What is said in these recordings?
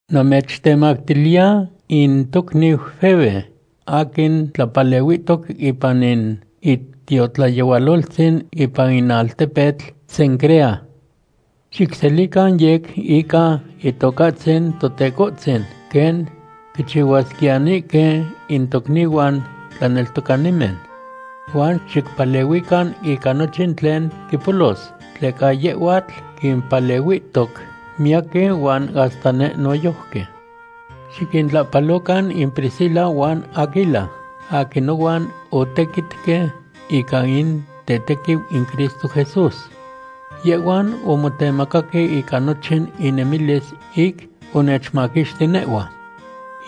Namechtemactiliya in tocniu Febe, aquin tlapalehuihtoc ipan in itiotlayehualoltzin ipan in altepetl Cencrea. Xicselican yec ica Itocahtzin Totecohtzin quen quichihuasquiyanihque in tocnihuan tlaneltocanimen. Huan xicpalehuican ica nochin tlen quipolos, tleca yehhuatl quimpalehuihtoc miyaquin huan hasta neh noyojqui. Xiquintlahpalocan in Priscila huan Aquila aquin nohuan otequitque ica in tetequiu in Cristo Jesús. Yehhuan omotemacaque ica nochin inemilis ic onechmaquixti nehhua.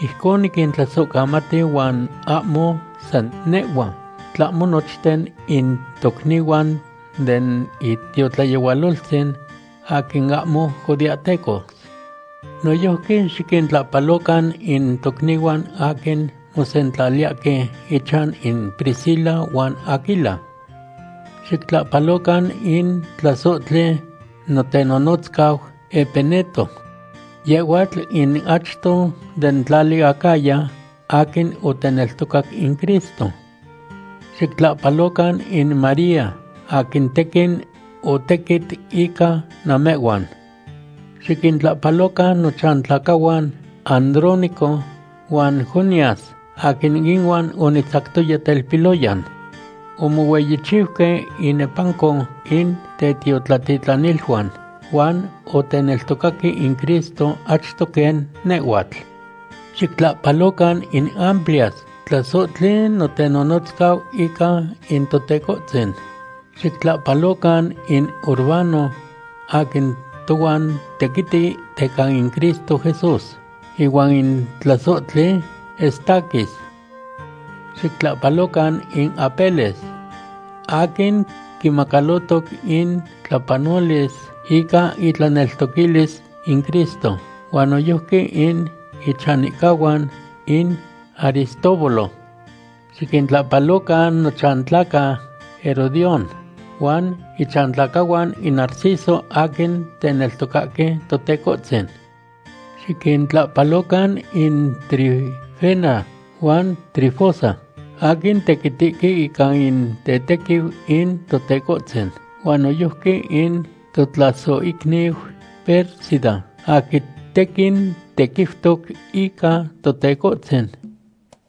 Ijcon niquintlasohcamati huan ahmo san nehhua, tlahmo nochten in tocnihuan den itiotlayehualoltzin aquin ahmo judeahtecos. Noyojqui xiquintlahpalocan in tocnihuan aquin mosentlaliyahque ichan in Priscila huan Aquila. Xictlahpalocan in tlasohtli notenonotzcau Epeneto. Yehhuatl in achto den tlali Acaya aquin oteneltocac in Cristo. Xictlahpalocan in María, aquin tequin otequit ica namehhuan. Xiquintlahpalocan nochantlacahuan Andrónico huan Junias aquin inuan onitzactoya telpiloyan. Omohueyichiuque inepanco in tetiotlatitlaniluan, huan oteneltocaque in Cristo achto quen nehhuatl. Xictlahpalocan in Amplias, tlasohtli notenonotzcau ica in Totecohtzin. Xictlahpalocan in Urbano aquin tohuan tequiti teca in Cristo Jesús, ihuan in tlasohtli Estaquis. Xictlahpalocan in Apeles, aquin quimacalotoc in tlapanolis ica itlaneltoquilis in Cristo, huan noyojqui in ichanihcahuan in Aristóbulo. Xiquintlahpalocan nochantlaca Herodión, huan ichantlacahuan in Narciso aquin teneltocahque Totecohtzin. Xiquintlahpalocan in Trifena huan Trifosa, aquin tequitihque ica in tetequiu in Totecohtzin, huan noyojqui in totlasohicniu Pérsida aquin tequin tequiutoc ica Totecohtzin.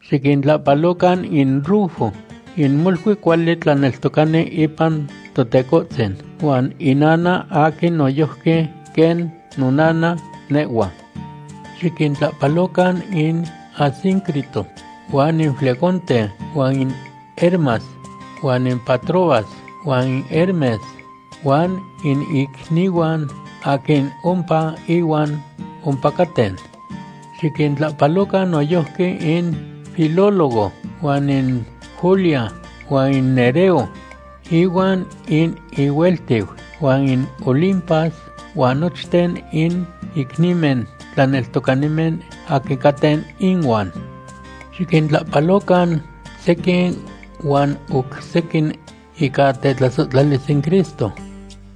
Xiquintlahpalocan in Rufo in molui cuali tlaneltocani ipan Totecohtzin, huan inana aquin noyojqui quen nonana nehhua. Xiquintlahpalocan in Asíncrito huan in Flegonte huan in Hermas, huan in Patrobas huan in Hermes huan in icnihuan aquin ompa ihuan ompacaten. Xiquintlahpalocan noyojqui in Filólogo huan in Julia, huan in Nereo ihuan in ihueltiu, huan in Olimpas huan nochten in icnimen tlaneltocanimen aquin caten inuan. Xiquintlahpalocan sequin huan oc sequin ica tetlasohtlalis in Cristo.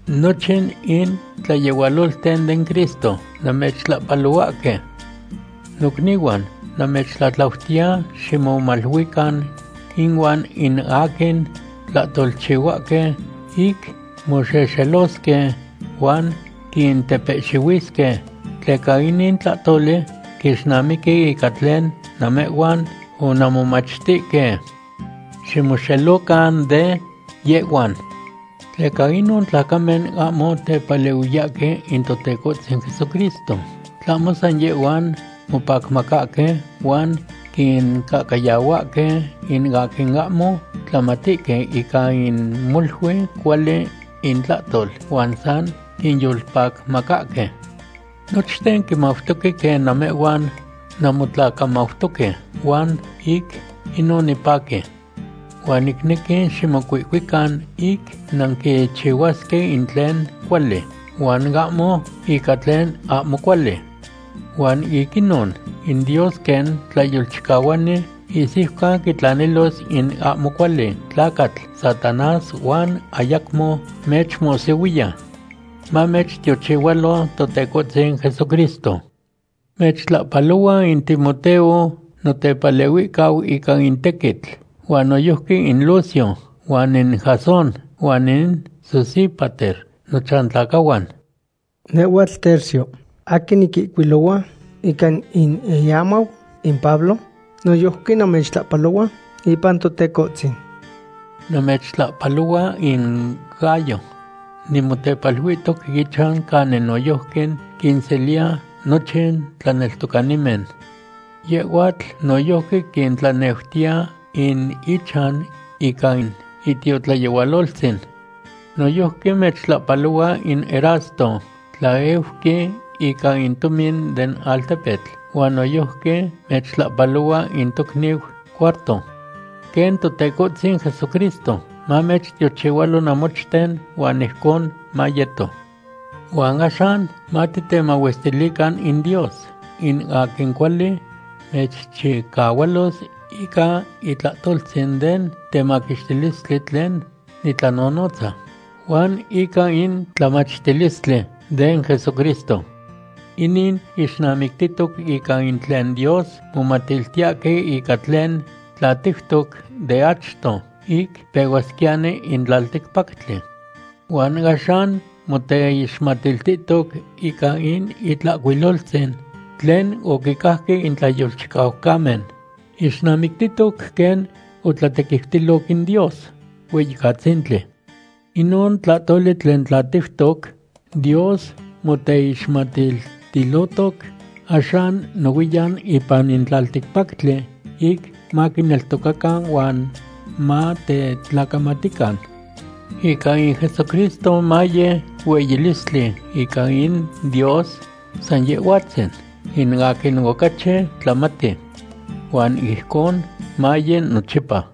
Nochin in tlayehualolten den Cristo namechtlahpalohuahque. Nocnihuan, namechtlatlautiya ximomaluican inuan in aquin tlahtolchihuahque ic moxexelosque huan quintepehxihuisque, tleca inin tlahtoli quixnamiqui ica tlen namehhuan onanmomachtihque. Ximoxelocan de yehhuan. Tleca inon tlacamen ahmo tepalehuiyahque in Totecohtzin Jesucristo, tlahmo san yehhuan mopacmacahque huan quincahcayahuahque in aquin ahmo tlamatihque ica in molui cuali intlahtol huan san quinyolpacmacahque. Nochten quimautoque quen namehhuan nanmotlacamautoque, huan ic inon nipaqui. Huan nicnequi ximocuihcuican ic nanquichihuasque in tlen cuali, huan ahmo ica tlen ahmo cuali. Huan ic inon in Dios quen Tlayolchicahuani ihsiucan quitlanilos in ahmo cuali tlacatl Satanás huan ayacmo mechmohsihuiya. Mamechtiochihualo Totecohtzin Jesucristo. Mechtlahpalohua in Timoteo notepalehuihcau ica in tequitl, huan noyojqui in Lucio huan in Jasón, huan in Sosípater nochantlacahuan. Nehhuatl Tercio aquin niquihcuilohua ica in iamau in Pablo, noyojqui namechtlahpalohua ipan Totecohtzin. Namechtlahpalohua in Gayo. Nimotepaluihtoc ichan canin noyojqui quinseliya nochin tlaneltocanimen. Yehhuatl noyojqui quintlaneutiya in ichan ica in itiotlayehualoltzin. Noyojqui mechtlahpalohua in Erasto, tlaeuqui ica in tomin den altepetl, huan noyojqui mechtlahpalohua in tocniu Cuarto. Quen Totecohtzin Jesucristo mamechtiochihualo namochten. Huan ijcon mayeto. Huan axan, matitemahuestilican in Dios, in aquin cuali mechchicahualos ica itlahtoltzin den temaquixtilistli tlen nitlanonotza, huan ica in tlamachtilistli den Jesucristo. Inin ixnamictihtoc ica in tlen Dios momatiltiyahque ica tlen tlatiutoc de achto ic pehuasquiyani in tlalticpactli. Huan axan moteixmatiltihtoc ica in Itlahcuiloltzin tlen oquicajque in tlayolchicaucamen, ixnamictitoc quen otlatequiutiloc in Dios Hueyicatzintli. Inon tlahtoli tlen tlatiutoc, Dios moteixmatiltilotoc axan nohuiyan ipan in tlalticpactli ic maquineltocacan huan matetlacamatican. Ica in Jesucristo maye hueyilistli ica in Dios san Yehhuatzin, in aquin ocachi tlamati. Huan ijcon maye nochipa.